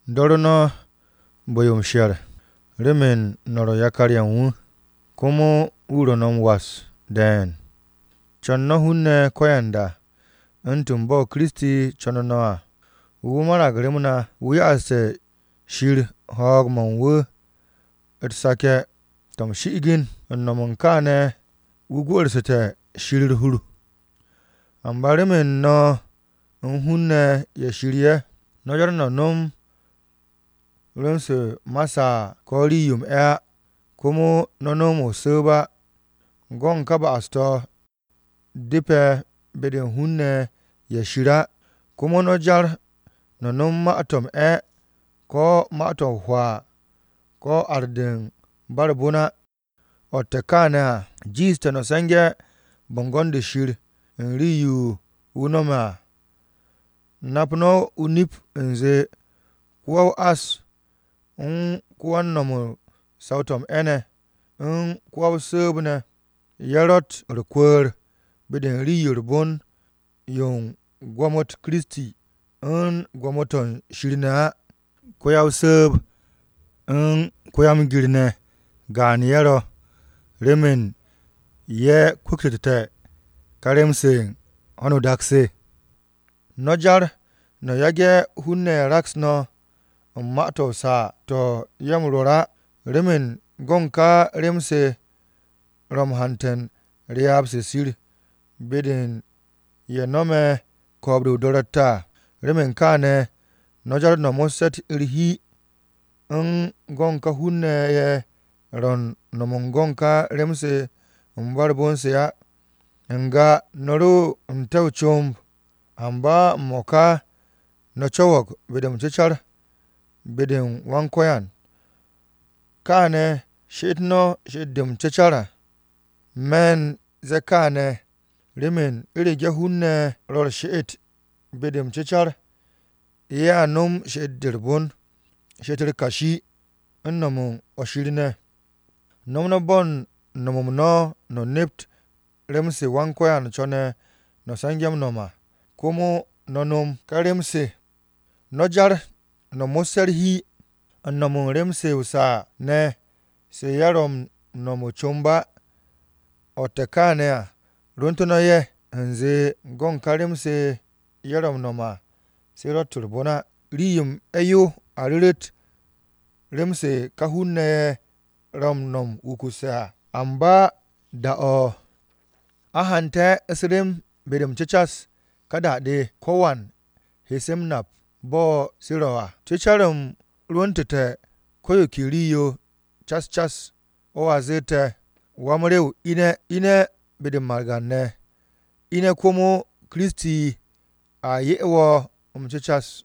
Do̱ru̱ no̱ bu̱-yo u̱n Shir remen no̱ ro̱ yakar-ye̱ u̱n wu̱, komo wu̱ ro̱ no̱ m-was de̱e̱n. Co̱n no̱ hun-ne̱ ko̱yanda, u̱ntu̱n bo̱ Kiristi co̱nu̱ no̱ à. Wu̱ marag rem na. Wu̱ ya'aste̱ Shir ho̱o̱g-mo̱ u̱n wu̱ u̱t-seke̱ to̱ m-shi'igin, u̱n no̱m u̱n kaane̱ wu̱ gwu̱'u̱rsu̱te̱ Shir u̱r-hur. Amba remen no̱ u̱n hun-ne̱ ye̱ Shir ye̱, no̱ jar no̱ no̱m rem-se ma saa ko̱ rii-yo m-'e̱ á, komo no̱ no̱m o-su̱u̱b á. Go̱ u̱n ka ba'as-to̱ depe̱ be-de u̱n hun-ne̱ ye̱ Shir á. Komo no̱ jar no̱ no̱m ma-to̱ m-'e̱ ko̱ ma-to̱ o-hwaa, ko̱ ar-de u̱n ba u̱r-bon á. O̱tte̱ kaane̱ à, jiishte̱ no̱ se̱nge̱ bo̱ngo̱n-de Shir u̱n rii-yo wu̱ no̱me̱ à. Nap no̱ o-nip u̱nze ko-wa-o-ás, u̱n ko-wan-no̱m u̱n saw-to̱ m-'e̱ ne̱, u̱n ko-wa-o-su̱u̱b ne̱, ye̱ ro̱tt u̱r-kwu̱ku̱r be-de u̱n rii-yo u̱r-bon yo u̱n gwo̱mo-u̱t Kiristi, u̱n gwo̱mo-to̱ u̱n Shir ne̱ á. Ko-ya-o-su̱u̱b u̱n ko-wa-m-gir ne̱ gaan-ye̱ ro̱, remen ye̱ kwu̱ktu̱te̱ ka rem-se u̱n ho̱no o-dak se. No̱ jar no̱ yage̱ hun-ne̱ raks no̱ u̱n ma-to̱ o-saa to̱ ye̱ m-rwo̱r á. Remen go̱ u̱n ka rem-se ro̱ m-hante̱ u̱n ryaab-se Shir be-de u̱n ye̱ no̱me̱ ko̱o̱b-de o-do̱ro̱tte̱ à. Remen kaane̱, no̱ jar no̱ mo̱sse̱ u̱r-hi u̱n go̱n ka hun-ne̱ ye̱ ro̱ u̱n no̱m u̱n go̱n ka rem-se u̱n ba u̱r-bon se ne̱ á. N-ga no̱ ro n-te̱ o-comb, amba m-mo̱ka no̱ co̱wo̱g be-de m-cecar be-de u̱n Wan-Ko̱yan. Káane̱ she'et no̱ she'et-de m-cecar. Me̱ u̱n ze̱e̱ kaane̱ remen u̱rege̱ hun-ne̱ ro̱ u̱r-she'et be-de m-cecar, ye̱a no̱m she'et-de u̱r-bon, she'et-u̱r kashi, u̱n no̱m u̱n o-nip ne̱. No̱m no̱ bo̱ u̱n no̱m-m no̱, no̱ nept rem-se Wan-Ko̱yan co̱ne̱ no̱ se̱nge̱ m-no̱m à, komo no̱ no̱m ka rem-se. No̱ jar no̱ mo̱sse̱ u̱r-hi u̱n no̱m u̱n rem-se o-saa ne̱ se ye̱ ro̱ m-no̱m o-comb á. O̱tte̱ kaane̱ à rwu̱ntu̱ no̱ ye̱, u̱nze go̱n ka rem-se ye̱ ro̱ m-no̱m à, se ro̱tt u̱r-bon á. Rii-yo m-'e̱ yo a ru̱ru̱t rem-se ka hun-ne̱ ye̱ ro̱ m-no̱m wukuse̱ à. Amba da-o̱ a hante̱ u̱s-rem be-de m-cecas, ka da-de, ko̱wan he se m-nap bo̱ se ro̱ à. Cu̱car-m rwu̱ntu̱te̱ ko̱ yo ke rii-yo cas cas. O̱ a zette̱, “Wa-m-rew ine̱! Ine̱ be-de u̱n margan-ne̱, Ine̱ komo Kiristi a 'ye wo̱ m-cecas.”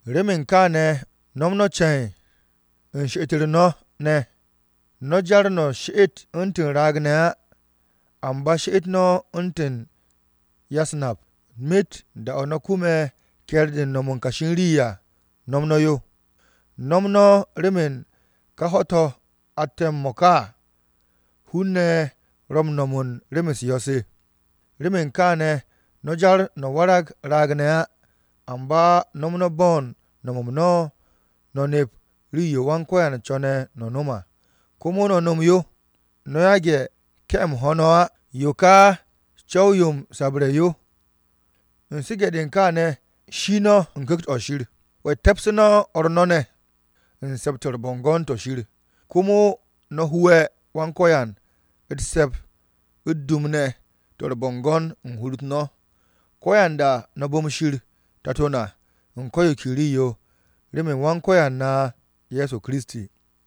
Remen kaane̱ no̱m no̱ ce̱n u̱n she'et-u̱r no̱ ne̱. No̱ jar no̱ she'et u̱ntu̱n raag-ne̱ á, amba she'et no̱ u̱ntu̱n ya-u̱s-nap. Myet da-o̱ no̱ kume̱ ke̱e̱r-de u̱n no̱m u̱n kashi u̱n rii à, no̱m no̱ yo. No̱m no̱ remen ka ho̱-to̱ atte̱ m-mo̱ka à, hun-ne̱ ro̱ m-no̱m u̱n rem-u̱s yo̱-se. Remen kaane̱ no̱ jar no̱ warag raag-ne̱ á, amba no̱m no̱ bo̱ u̱n no̱m-m no̱, no̱ nept rii-yo Wan-Ko̱yan co̱ne̱ no̱ no̱m à, komo no̱ no̱m yo. No̱ yage̱ ke̱-m ho no̱ á. Yo ka co̱w-yo m-sabre̱ yo. U̱n su̱ge̱-de u̱n kaane̱, shi no̱ u̱n Ku̱kt-o̱ Shir. Te̱pse̱ no̱ o̱r no̱ ne̱ u̱n Se̱p-to̱ u̱r-Bo̱ngo̱n to̱ Shir. Komo no̱ hu'e̱ Wan-Ko̱yan u̱t-se̱p u̱t-dum ne̱ to̱ u̱r-bo̱ngo̱n u̱n hur-u̱t no̱. Ko̱yanda no̱ bu̱m Shir Tato na u̱n ko̱ yo ke rii-yo, remen Wan-Ko̱yan na Ye̱so Kiristi.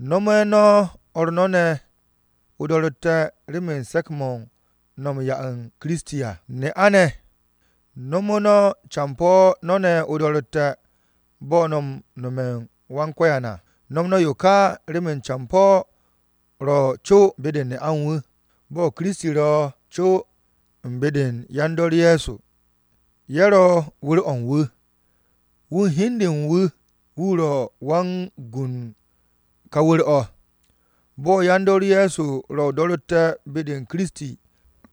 No̱me̱ no̱ o̱r no̱ ne̱ o-do̱ro̱tte̱ remen se̱k-mo̱ no̱ u̱n m-'ya u̱n Kiristi à. Ne'a-ne̱ no̱me̱ no̱ campo̱ no̱ ne̱ o-do̱ro̱tte̱, bo̱ no̱ m-no̱me̱ u̱n Wan-Ko̱yan à. No̱m no̱ yo ka remen campo̱ ro̱ co be-de u̱n ne'a u̱n wu̱, bo̱ Kiristi ro̱ co u̱n be-de u̱n yan-dor Ye̱so, ye̱ ro̱ wu̱r-o̱ u̱n wu̱. Wu̱ u̱n hi u̱n de u̱n wu̱, wu̱ ro̱ Wan-Gwu̱ u̱n ka wu̱r-o̱. Bo̱ yan-dor Ye̱so ro̱ o-do̱ro̱tte̱ be-de u̱n Kiristi,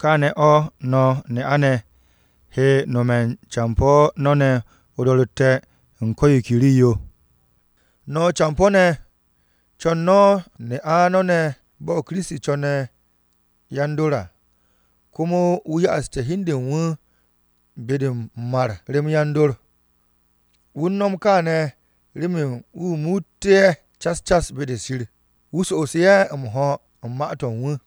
kaane̱ o̱ no̱ ne'a-ne̱ he no̱me̱ u̱n campo̱ no̱ ne̱ o-do̱ro̱tte̱ u̱n ko̱ yo ke rii-yo. No̱ campo̱-ne̱ co̱n no̱ ne'a no̱ ne̱, bo̱ Kiristi co̱ne̱ yan-dor à, komo wu̱ ya'asu̱ru̱ hi u̱n de u̱n wu̱ be-de m-mar rem yan-dor. Wu̱ u̱n no̱m kaane̱ remen wu̱ muuté̱ ye̱ cas cas be-de Shir, wu̱ so'os ye̱ m-ho̱ u̱n Ma-to̱ u̱n wu̱.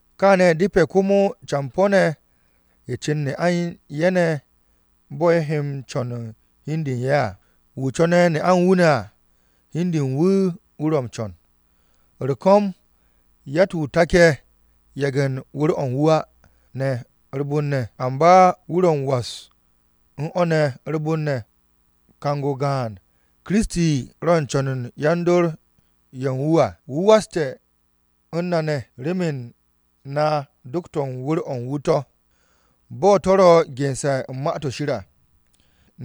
Kaane̱ depe̱ komo campo̱-ne̱ cu̱n ne'a u̱n ye̱ ne̱ bo̱ ye̱ m-co̱n u̱n hi u̱n de u̱n ye̱ à. Wu̱ co̱ne̱ ne'a u̱n wu̱ ne̱ à, hi u̱n de u̱n wu̱, wu̱ ro̱ m-co̱n. U̱r-ko̱m, yatt-wu̱ take̱ yage̱ u̱n wu̱r-o̱ wu̱ á, amba wu̱ ro̱ u̱n m-was u̱n o̱ ne̱ u̱r-bon ne̱. Kang-o gaan, Kiristi ro̱ u̱n co̱n u̱n yan-dor ye̱ u̱n wu̱. Wu̱ waste̱ u̱n na ne̱ remen na do̱k-to̱ u̱n wu̱r-o̱ u̱n wu̱ to̱. Bo̱ to̱ ro̱ gense̱ u̱n Ma-to̱ Shir à,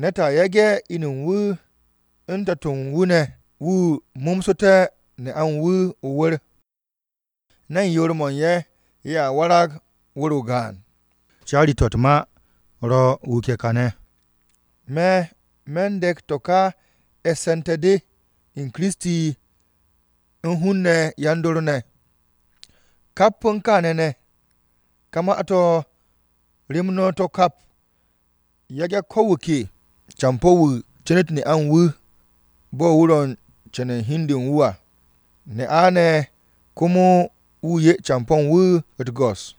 “Ne̱t a yage̱ inu u̱n wu̱, u̱n tato-o̱ u̱n wu̱ ne̱, wu̱ mo̱msu̱te̱ ne'a u̱n wu̱ o-wu̱r, ne̱n yoor-mo̱ u̱n ye̱, ye̱a warag wu̱r-o gaan.” Caari-to̱ u̱t-ma ro̱ wuke̱ kane̱. Me̱ me̱n de̱k to̱ u̱n e̱sse̱nte̱-de u̱n Kiristi u̱n hun-ne̱ yan-dor ne̱. Kap u̱n kaane̱ ne̱, ka ma-to̱ rem no̱ to̱ kap. Yage̱ ko̱ wu̱ ke campo̱-wu̱ cu̱nu̱t ne'a u̱n wu̱, bo̱ wu̱ ro̱ u̱n co̱nu̱ u̱n hi u̱n de u̱n wu̱ à. Ne'a ne̱, komo wu̱ 'ye campo̱ u̱n wu̱ u̱t-go̱s.